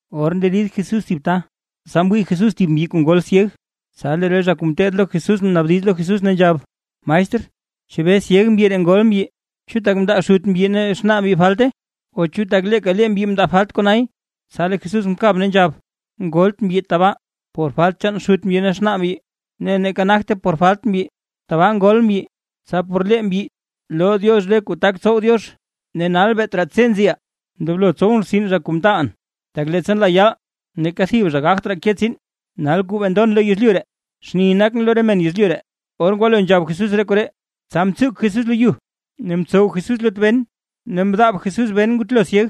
Or nderid Jesús thib ta, tsa mwii Jesús thib mbyi kuu ngol syeg. Tsa lee re zha kuu ngeteed lo Jesús mnaabdiz lo Jesús ne nzhab: ―Maestr, ¿chebee syeg mbyi ree ngol mbyi? ¿Chu tak mndaa xut mbyi ne xnaa mbyi falte o chu tak leeka mbyi mndaa falt konay? Tsa lee Jesús mkab ne nzhab: ―Ngolt mbyi tabaa, por falt chaan xut mbyi ne xnaa mbyi, neeka nagte por falt mbyi, tabaa ngol mbyi, tsa por lee mbyi loo Diox re kuu tak tsow Diox. Ne nal beet raa tse nziʼaa, ndoblo tsowʼn rtsin zha kuu mtaalʼn, tak leettsa nlaa yaal neeka thib zha gagt raa ke tsiin. Nal kuu bee ndon lo yezlyu ree, xni nakʼn lo re men yezlyu ree. Or ngwalo nzhab Jesús re koree, tsa mtsuk Jesús lo yu, ne mtsow Jesús lut ben ne mdaab Jesús ben ngutlo syeg.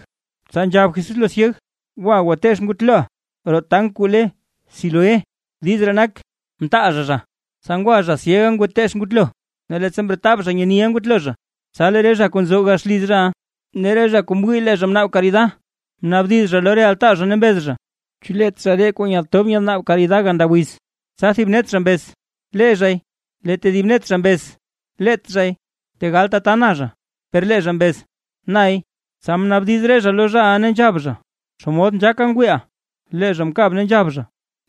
Tsa nzhab Jesús lo syeg: ―Gwa, gwateech ngutloʼa roo tank kuu le Siloé. (Diiz ree nak: “Ntaal zha zha”.) Tsa ngwa zha syega ngwateech ngutlo, ne leettsa mretab zha nyeniʼa ngutlo zha. Tsa lee re zha kuu nzo gax liz zhaʼa, ne re zha kuu mwii lee zha mnaab karida, mnaabdiz zha lo re altaa zha ne mbez zha: ―¿Chu leet zha ree kuu nyatob nyanaab karida ganda wiz? Tsa thib net zha mbez: ―Lee zhay. Lee tedib net zha mbez: ―Leet zhay, tegal tata na zha. Per lee zha mbez: ―Nay. Tsa mnaabdiz re zha lo zhaʼa ne nzhab zha: ―¿Xomod nzhaaka ngwiiʼa? Lee zha mkab ne nzhab: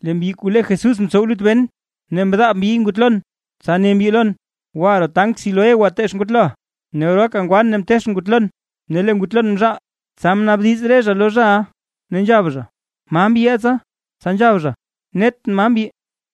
―Lee mbyi kuu lee Jesús mtsow lut ben, ne mdaab mbyiy ngutlon, tsa ne mbyi lon: “Gwa roo tank Siloé gwateech ngutloʼa”. Ne oraaka ngwan ne mteechʼn ngutlon, ne lee ngutlon mzhaal. Tsa mnaabdiz re zha lo zhaʼa ne nzhab zha: ―¿Ma mbyiʼa tsa? Tsa nzhab zha: ―Netʼn, ma mbyi.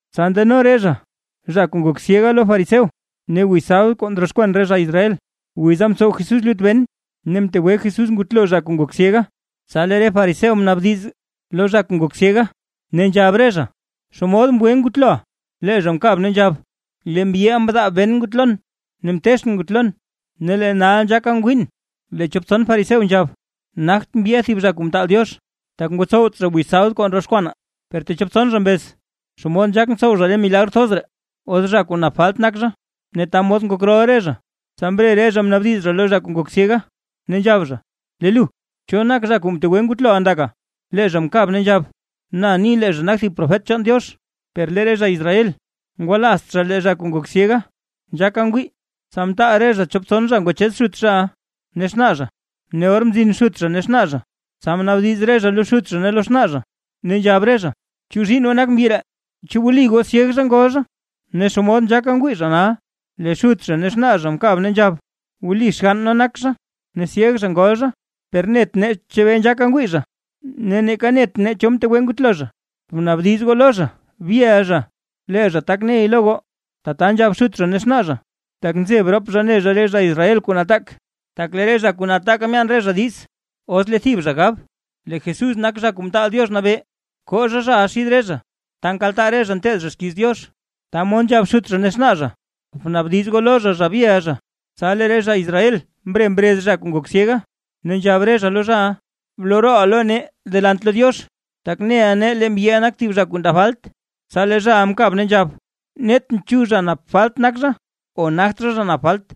Tsa ndano re zha zha kuu ngok syega lo re fariseo. Ne wiz sabd kuu ndroxkwan re zha Israel, wiza mtsow Jesús lut ben ne mtegwe Jesús ngutlo zha kuu ngok syega. Tsa lee re fariseo mnaabdiz lo zha kuu ngok syega ne nzhab re zha: ―¿Xomod mgwe ngutloʼa? Lee zha mkab ne nzhab: ―Lee mbyiʼa mdaab ben ngutlon, ne mteechʼn ngutlon, ne lee nal nzhaaka ngwiin. Lee chop tson fariseo nzhab: ―Nagt mbyiʼa thib zha kuu mtaal Diox, tak ngotsowt zha wiz sabd kuu ndroxkwanaa. Per techop tson zha mbez: ―¿Xomod nzhaak ntsow zha re milagr thoz ree, os zha kuu nap falt nak zha? Ne ta mod ngok rol re zha. Tsa mre re zha mnaabdiz zha lo zha kuu ngok syega, ne nzhab zha: ―Lee lu, ¿cho nak zha kuu mtegwe ngutloʼa ndaka? Lee zha mkab ne nzhab: ―Na ni lee zha nak thib profet chaan Diox. Per lee re zha Israel ngwalaazt zha lee zha kuu ngok syega, nzhaaka ngwii, tsa mtaal re zha chop tson zha ngwachez xut zhaʼa ne xnaa zha, ne or mzin xut zha ne xnaa zha, tsa mnaabdiz re zha lo xut zha ne lo xnaa zha, ne nzhab re zha: ―¿Chu zhiinn goo nak mbyi ree? ¿Chu wli goo syeg zha ngol zha? ¿Ne xomod nzhaaka ngwii zha nal? Lee xut zha ne xnaa zha mkab ne nzhab: ―Wli xgann nee nak zha, ne syeg zha ngol zha, per net nee chebee nzhaaka ngwii zha, ne neeka net nee cho mtegwe ngutlo zha. Bnaabdiz goo lo zha zha byeʼa zha, lee zha tak ney lo goo. Tata nzhab xut zha ne xnaa zha, tak nzeb rop zha ne zha re zha Israel kuu nataak, tak lee re zha kuu nataaka myaan re zha diiz, os lee thib zha gab lee Jesús nak Zha Kuu Mtaal Diox Nabee, koo zha zhaʼa xid re zha ta nkaltaa re zha nteed zha xkiiz Diox. Ta mod nzhab xut zha ne xnaa zha: “Bnaabdiz goo lo zha zha byeʼa zha”. Tsa lee re zha Israel mre mrez zha kuu ngok syega, ne nzhab re zha lo zhaʼa: ―Bloo rooʼa lo nee delant lo Diox. Tak neʼa nee lee mbyiʼa nak thib zha kuu ndaa falt. Tsa lee zhaʼa mkab ne nzhab: ―Netʼn chu zha nap falt nak zha o nagt zha zha kuu nap falt.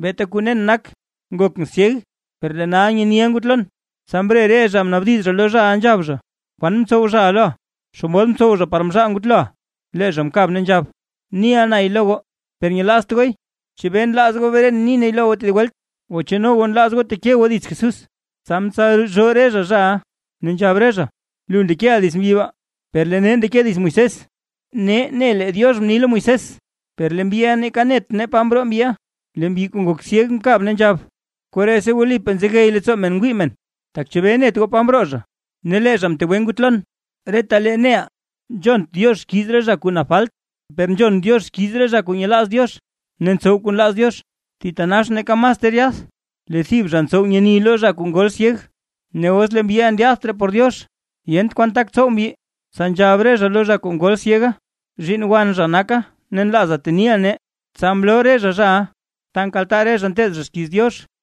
Beeta kuu nen nak, ngokʼn syeg, per lee nal nyeniʼa ngutlon. Tsa mre re zha mnaabdiz zha lo zhaʼa nzhab zha: ―¿Kwan mtsow zhaʼa loʼa? ¿Xomod mtsow zha par mzhaal ngutloʼa? Lee zha mkab ne nzhab: ―Niʼa nay lo goo, per nyelaazt gooy. ¿Chebee nlaaz goo bren ni nay lo goo tedib welt? O, ¿chu no goo nlaaz goo teke goo dits Jesús? Tsa mtsalzhoo re zha zhaʼa, ne nzhab re zha: ―Lu ndekeʼa dits mbyiʼa, per lee nee ndeke nee dits Moisés. Nee ne lee Diox mni lo Moisés, per lee mbyiʼa neeka net nee pa mroo mbyiʼa. Lee mbyi kuu ngok syega mkab ne nzhab: ―¡Koree si wlipaa nzegey leettsoo men ngwii men! Tak ¿chebee net goo pa mroo zha, ne lee zha mtegwe ngutlon? Retalee neʼaa nzhont Diox xkiiz re zha kuu nap falt, per nzhon Diox xkiiz re zha kuu nyelaaz Diox ne ntsow kuu nlaaz Diox. Thitanax neeka mas ter yath, lee thib zha ntsow nyeni lo thib zha kuu ngol syeg. Os lee mbyiʼa ndyaadt por Diox, yent kwan tak tsow mbyi. Tsa nzhab re zha lo zha kuu ngol syega: ―¡Zhiinn wan zha naka! Ne nlaaza teniʼa nee. Tsa mloo re zha zhaʼa ta nkaltaa re zha nteed zha xkiiz Diox.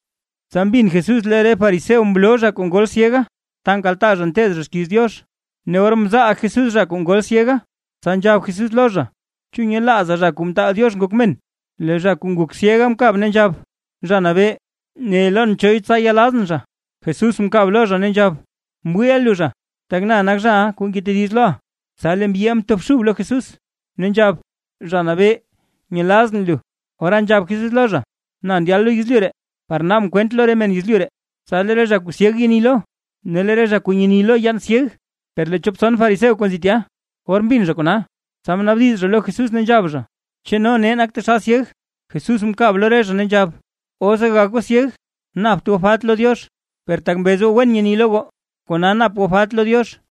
Tsa mbin Jesús lee re fariseo mloo zha kuu ngol syega, ta nkaltaa zha nteed zha xkiiz Diox, ne or mzaal Jesús zha kuu ngok syega, tsa nzhab Jesús lo zha: ―¿Chu nyelaaza, Zha Kuu Mtaal Diox Ngok Men? Lee zha kuu ngok syega mkab ne nzhab: ―Zha Nabee, ne lon choy, tsa yelazʼn zha. Jesús mkab lo zha ne nzhab: ―Mwiiʼa lu zha, tak na nak zhaʼa kuu ngetediz loʼa. Tsa lee mbyiʼa mtobxub lo Jesús ne nzhab: ―Zha Nabee, nyelazʼn lu. Ora nzhab Jesús lo zha: ―Na ndyalʼn lo yezlyu ree par naabʼn kwent lo re men yezlyu ree, tsa lee re zha kuu syeg yeni lo, ne lee re zha kuu nyeni lo yaan syeg. Per lee chop tson fariseo kuu nzi tya, or mbin zha kona, tsa mnaabdiz zha lo Jesús ne nzhab zha: ―¿Chu no nee nak nee taxal syeg? Jesús mkab lo re zha ne nzhab: ―Os gagak goo syeg, napt goo falt lo Diox. Per tak mbez goo wen nyeni lo goo, kona nap goo falt lo Diox.